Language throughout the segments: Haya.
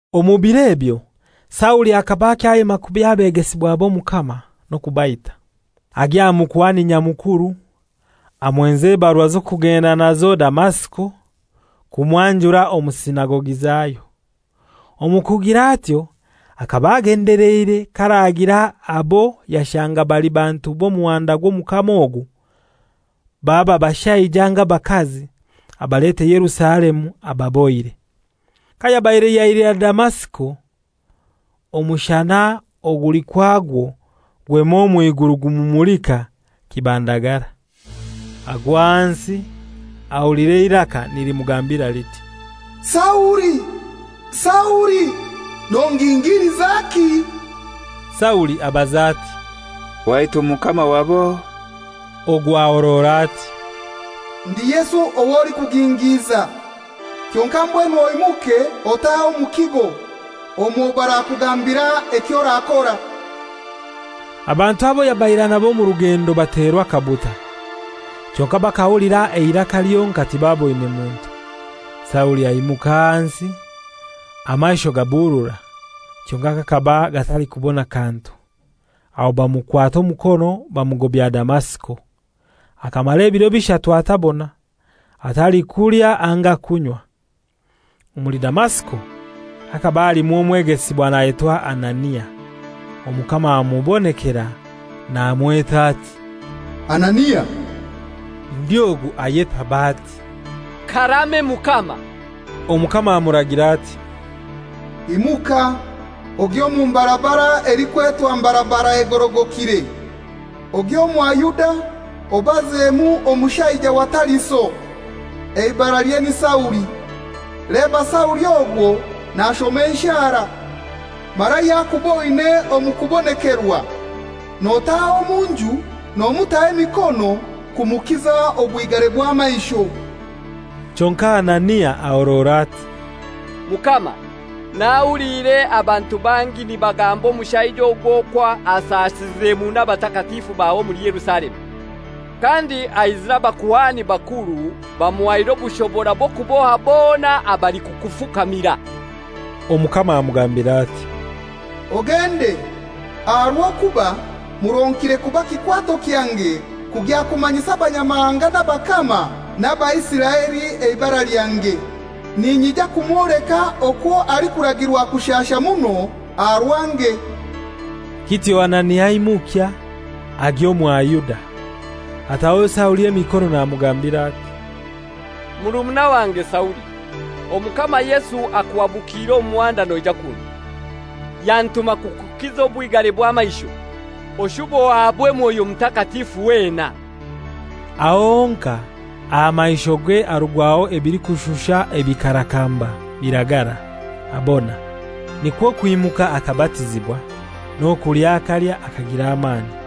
Omu biro ebyo Sauli akaba akyayema kubi abegesibwa b'Omukama, n'okubaita. Agya aha Mukuhani Nyamukuru amwenza ebarua z'okugenda nazo Damasiko kumwanjura omu sinagogi zayo. Omu kugira atyo akaba agendeleire k'aragira abo yashanga bali bantu b'Omuhanda gw'Omukama ogu, baba bashaija anga bakazi abalete Yerusalemu abababohire. Kayabaire yailira Damasiko, omushana oguli kwagwo gwema omw'iguru gumumulika kibandagara. Agwa ahansi, ahulira eiraka nilimugambira liti, «Sauli, Sauli, nongingililizaki?» Sauli abaza ati, «Waitu Mukama wab'ohai?» Ogu ahorora ati, «Ndi Yesu ow'olikugingiiza. Kyonkai mbwenu oimuke otahe omu kigo, omwo barakugambira eky'orakora.» Abantu abo yabaire ainabo omurugendo baterwa akabuta, kyonkai bakahulira eiraka lyonkai, tibaboine muntu. Sauli aimuka ahansi. Amaisho gaburura, kyonkai gakaba gatalikubona kantu. Aho bamukwata omukono bamugobya Damasiko. Akamara ebiro bishatu atabona, atalikulya anga kunywa. Omuli Damasiko hakaba halimu omwegesibwa nayetwa Anania. Omukama amubonekera namweta ati, «Anania!» Ndi ogu ayetaba ati, «Karame, Mukama!» Omukama amuragira ati, «Imuka ogye omu mbarabara elikwetwa ‹Mbarabara egorogokire,› ogye omwa Yuda obazemu omushaija wa Tariso, eibaralye ni Sauli. Leba Sauli ogwo nashoma enshara, mara yakuboine omu kubonekerwa notaha omu nju namutaho emikono kumukiza obwigare bw'amaisho.» Kyonkai Anania ahorora ati, «Mukama, nahuliire abantu bangi nibagamba omushaija ogu okwo ashasize muno abatakatifu bawe omuli Yerusalemu. Kandi aizire abakuhani bakuru bamuhaire obushobora bw'okuboha bona abalikukufukamira.» Omukama amugambira ati, «Ogende, aha rw'okuba muronkire kuba kikwato kyange kugya kumanyisa abanyamahanga n'abakama n'Abaisiraeli eibara lyange. Ninyija kumwoleka okwo alikuragirwa kushasha muno aha rwange lyange.» Kityo Anania aimukya, agya omwa Yuda. Ataho Sauli emikono namugambira ati, «Murumuna wange Sauli, Omukama Yesu akuhabukiire omu muhanda noija kunu, yantuma kukukiza obwigare bw'amaisho, oshube ohabwe Mwoyo Mutakatifu wena.» Aho honkai aha maishoge harugwaho ebilikushusha ebikarakamba, biragara, abona. Nikwo kwimuka akabatizibwa, n'okulya akalya, akagira amani.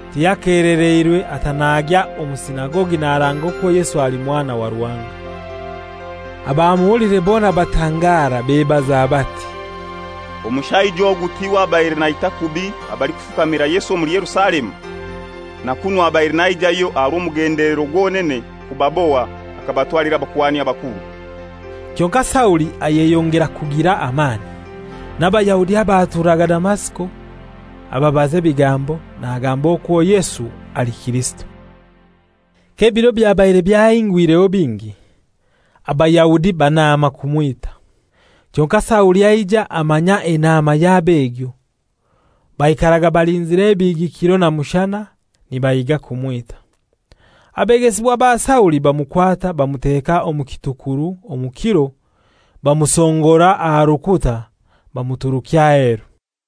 Tiyakelereirwe ata nagya omu sinagogi naranga okwo Yesu ali Mwana wa Ruhanga. Abamuhuliire bona batangara, bebaza bati, «Omushaija ogu tiwe abaire naita kubi abalikufukamira Yesu omuli Yerusalemu? Na kunu abaire naijayo aha rw'omugendelero gwonene kubaboha akabatwalira abakuhani bakuru.» Kyonkai Sauli ayeyongera kugira amani, n'Abayahudi abaturaga Damasiko ababaza ebigambo, nagamba okwo Yesu ali Kirisito. K'ebiro byabaire byahingwireho bingi, Abayahudi banaama kumwita. Kyonkai Sauli aija amanya enaama yabo egyo. Baikaraga balinzire ebihigi kiro na mushana, nibahiga kumwita. Abegesibwa ba Sauli bamukwata bamuteeka omu kitukuru omu kiro, bamusongora aha rukuta bamuturukya aheru.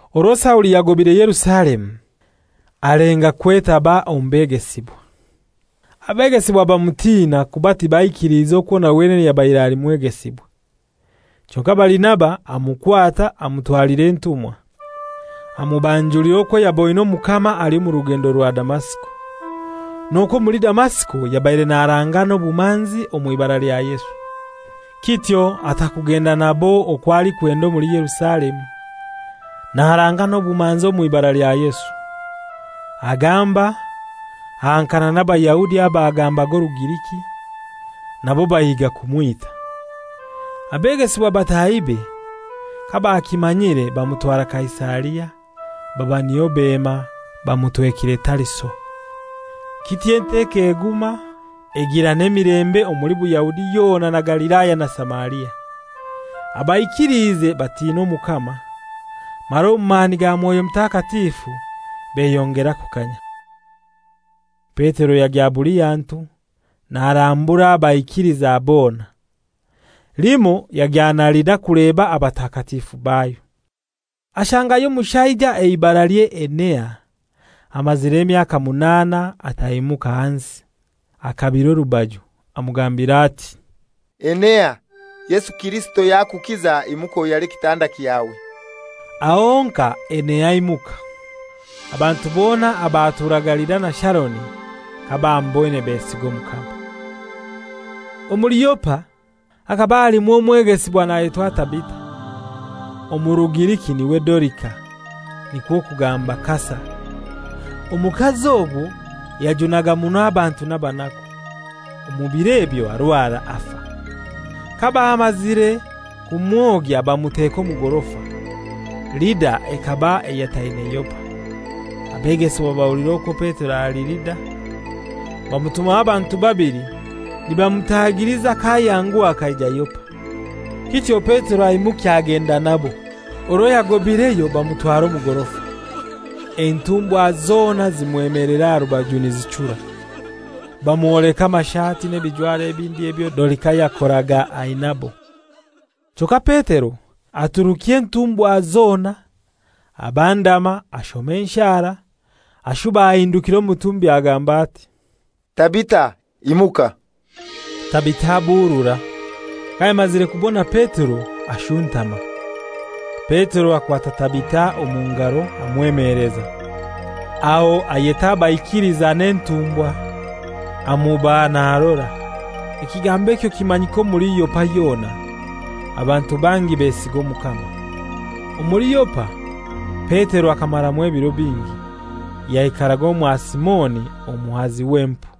Orwo Sauli yagobaire Yerusalemu alenga kwetaba omu begesibwa. Abegesibwa bamutina kuba tibaikiliize okwo na wenene yabaire ali mwegesibwa. Kyonkai Barinaba amukwata amutwalira entumwa, amubanjulira okwo yaboine Omukama ali omu rugendo rwa Damasiko, n'okwo omuli Damasiko yabaire naranga n'obumanzi omw'ibara lya Yesu. Kityo ata kugenda nabo okwo alikwenda omuli Yerusalemu, naranga n'obumanzi omw'ibara lya Yesu. Agamba, ahankana n'Abayahudi abagambaga Orugiriki; nabo bahiga kumwita. Abegesibwa batahibe kabakimanyire bamutwara Kaisaria, baba niyo bema bamutwekire Tariso. Kityo enteko eguma, egira n'emilembe omuli Buyahudi yona na Galilaya na Samaria. Abaikiliize batina Omukama, mara omu mani ga Mwoyo Mutakatifu beyongera kukanya. Petero yagya buli hantu, narambura abaikiliza bona. Limoi yagya na Lida kuleba abatakatifu bayo. Ashangayo omushaija eibaralye Enea, amazire emyaka munaana ataimuka hansi, akabire orubaju. Amugambira ati, «Enea, Yesu Kirisito yakukiza; imuka oyare ekitanda kyawe.» Aho honkai Enea aimuka. Abantu bona abaturaga Lida na Sharoni kabamuboine besiga Omukama. Omuli Yopa hakaba halimu omwegesibwa nayetwa Tabita, omu Rugiriki n'iwe Dorika (nikwo kugamba Kasa). Omukazi ogwo yajunaga muno abantu n'abanaku. Omu biro ebyo arwara, afa. Kabamazire kumwogya bamuteka omu gorofa. Lida ekaba eyataine Yopa. Abegesibwa bahulira okwo Petero ali Lida, bamutumaho abantu babili nibamutagiliza k'ayanguha akaija Yopa. Kityo Petero aimukya agenda nabo. Orwo yagobaireyo bamutwara omu gorofa. Entumbwa zona zimwemelera aha rubaju nizichura. Bamwoleka amashati n'ebijwaro ebindi ebyo Dorika yakoraga ainabo. Kyonkai Petero aturukya entumbwa zona, abandama, ashoma enshara. Ashuba ahindukira omutumbi agamba ati, «Tabita, imuka.» Tabita aburura; kayamazire kubona Petero, ashuntama. Petero akwata Tabita omu ngaro, amwemeleza. Aho ayeta abaikiliza n'entumbwakazi amubaha narora. Ekigambo ekyo kimanyika omuli Yopa yona, abantu bangi besiga Omukama. Omuli Yopa Petero akamaramu ebiro bingi. Yaikaraga omwa Simoni omuhazi w'empu.